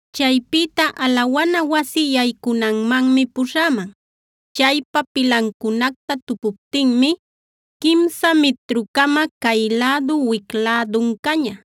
Chaypïta alawana wasi yaycunanmanmi puśhäman. Chaypa pilancunacta tupuptinmi quimsa mitru-cama cay lädu wic lädun caña.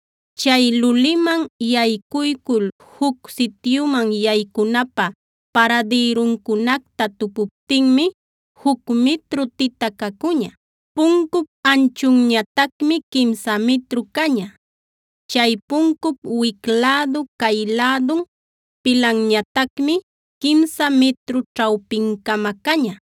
Chay luliman yaycuycul juc sityuman yaycunapä paradïruncunacta tupuptinmi juc mitru tita cacuña. Puncup anchunñatacmi quimsa mitru caña. Chay puncup wic lädu, cay lädun pilanñatacmi quimsa mitru ćhawpin-cama caña.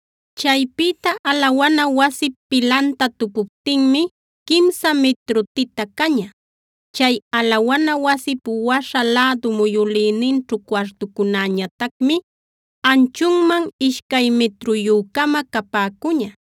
Chaypïta alawana wasip pilanta tupuptinmi quimsa mitru tita caña. Chay alawana wasip waśha lädu muyülïninćhu cuartucunäñatacmi anchunman ishcay mitruyü-cama capäcuña.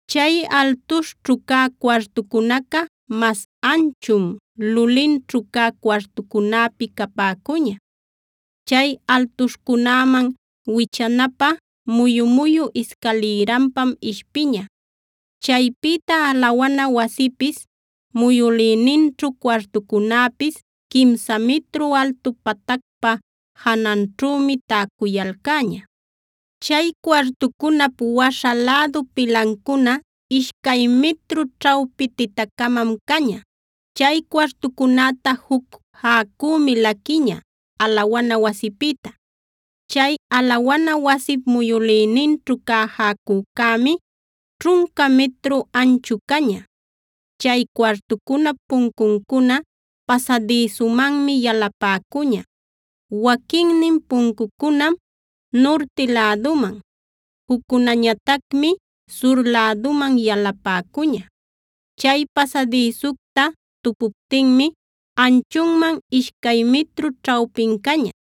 Chay altuśhćhu cä cuartucunaca mas anchum lulinćhu cä cuartucunäpi capäcuña. Chay altuśhcunäman wichanapä muyu-muyu iscalïranpam ishpiña. Chaypïta alawana wasipis, muyülïninćhu cuartucunäpis quimsa mitru altu patacpa jananćhümi täcuyalcäña. Chay cuartucunap waśha lädu pilancuna ishcay mitru ćhawpi tita-camam caña. Chay cuartucunäta juc jäcümi laquiña alawana wasipïta. Chay alawana wasip muyülïninćhu cä jäcücämi ćhunca mitru anchu caña. Chay cuartucunap puncuncuna pasadïsumanmi yalapäcuña. Waquinnin puncucunam nurti läduman, juccunäñatacmi sur läduman yalapäcuña. Chay pasadïsucta tupuptinmi anchunman ishcay mitru ćhawpin caña.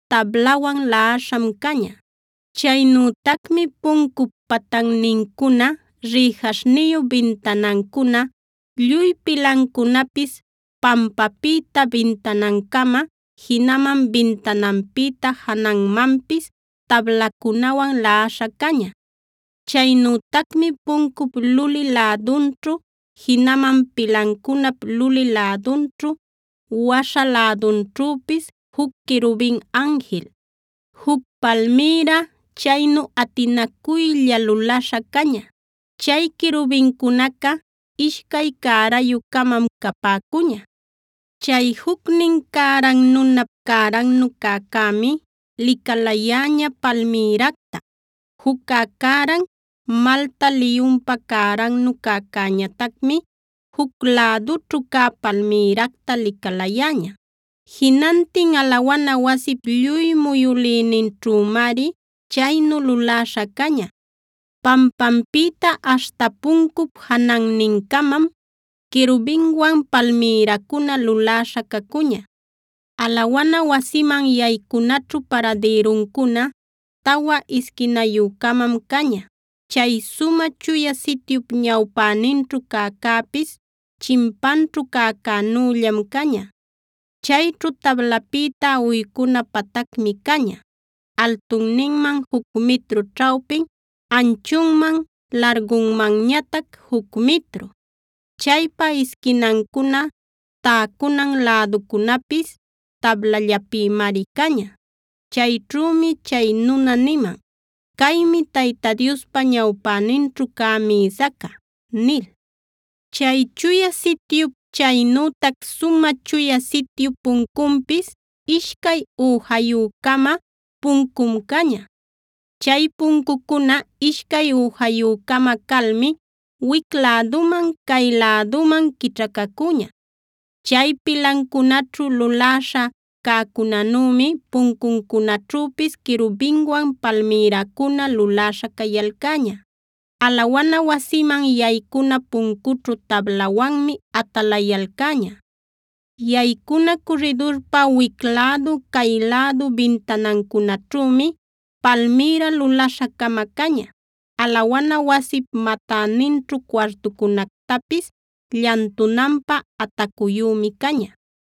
tablawan laꞌaśham caña. Chaynütacmi puncup patannincuna, rïjaśhniyu bintanancuna, lluy pilancunapis pampäpïta bintanancama, jinaman bintananpïta jananmanpis tablacunawan laꞌaśha caña. Chaynütacmi puncup luli lädunćhu, jinaman pilancunap luli lädunćhu, waśha lädunćhüpis, juc querubin anjil, juc palmïra chaynu atinacuylla luläśha caña. Chay querubincunaca ishcay cärayu-camam capäcuña. Chay jucnin cäran nunap cärannu cäcämi licalayäña palmïracta. Juccä cäran malta liyunpa cärannu cäcäñatacmi juc lädućhu cä palmïracta licalayäña. Jinantin alawana wasip lluy muyülïninćhümari chaynu luläśha caña. Pampanpïta aśhta puncup janannincamam, querubinwan palmïracuna luläśha cacuña. Alawana wasiman yaycunaćhu paradïruncuna tawa isquinayü-camam caña. Chay Sumä Chuya Sityup ñawpäninćhu cäcäpis chimpanćhu cäcänüllam caña. Chayćhu tablapïta uycuna patacmi caña; altunninman juc mitru ćhawpin, anchunman largunmanñatac juc mitru. Chaypa isquinancuna, täcunan, läduncunapis tablallapïmari caña. Chayćhümi chay nuna niman: “Caymi Tayta Diospa ñawpäninćhu cä mïsaca” nil. Chay Chuya Sityup, chaynütac Sumä Chuya Sityup puncunpis ishcay üjayü-cama puncum caña. Chay puncucuna ishcay üjayü-cama calmi, wic läduman cay läduman quićhacacuña. Chay pilancunaćhu luläśha cäcunänümi puncuncunaćhüpis querubinwan palmïracuna luläśha cayalcäña. Alawana wasiman yaycuna puncućhu tablawanmi atalayalcäña. Yaycuna curridurpa wic lädu, cay lädu bintanancunaćhümi palmïra luläśha-cama caña. Alawana wasip matäninćhu cuartucunactapis llantunanpä atacuyümi caña.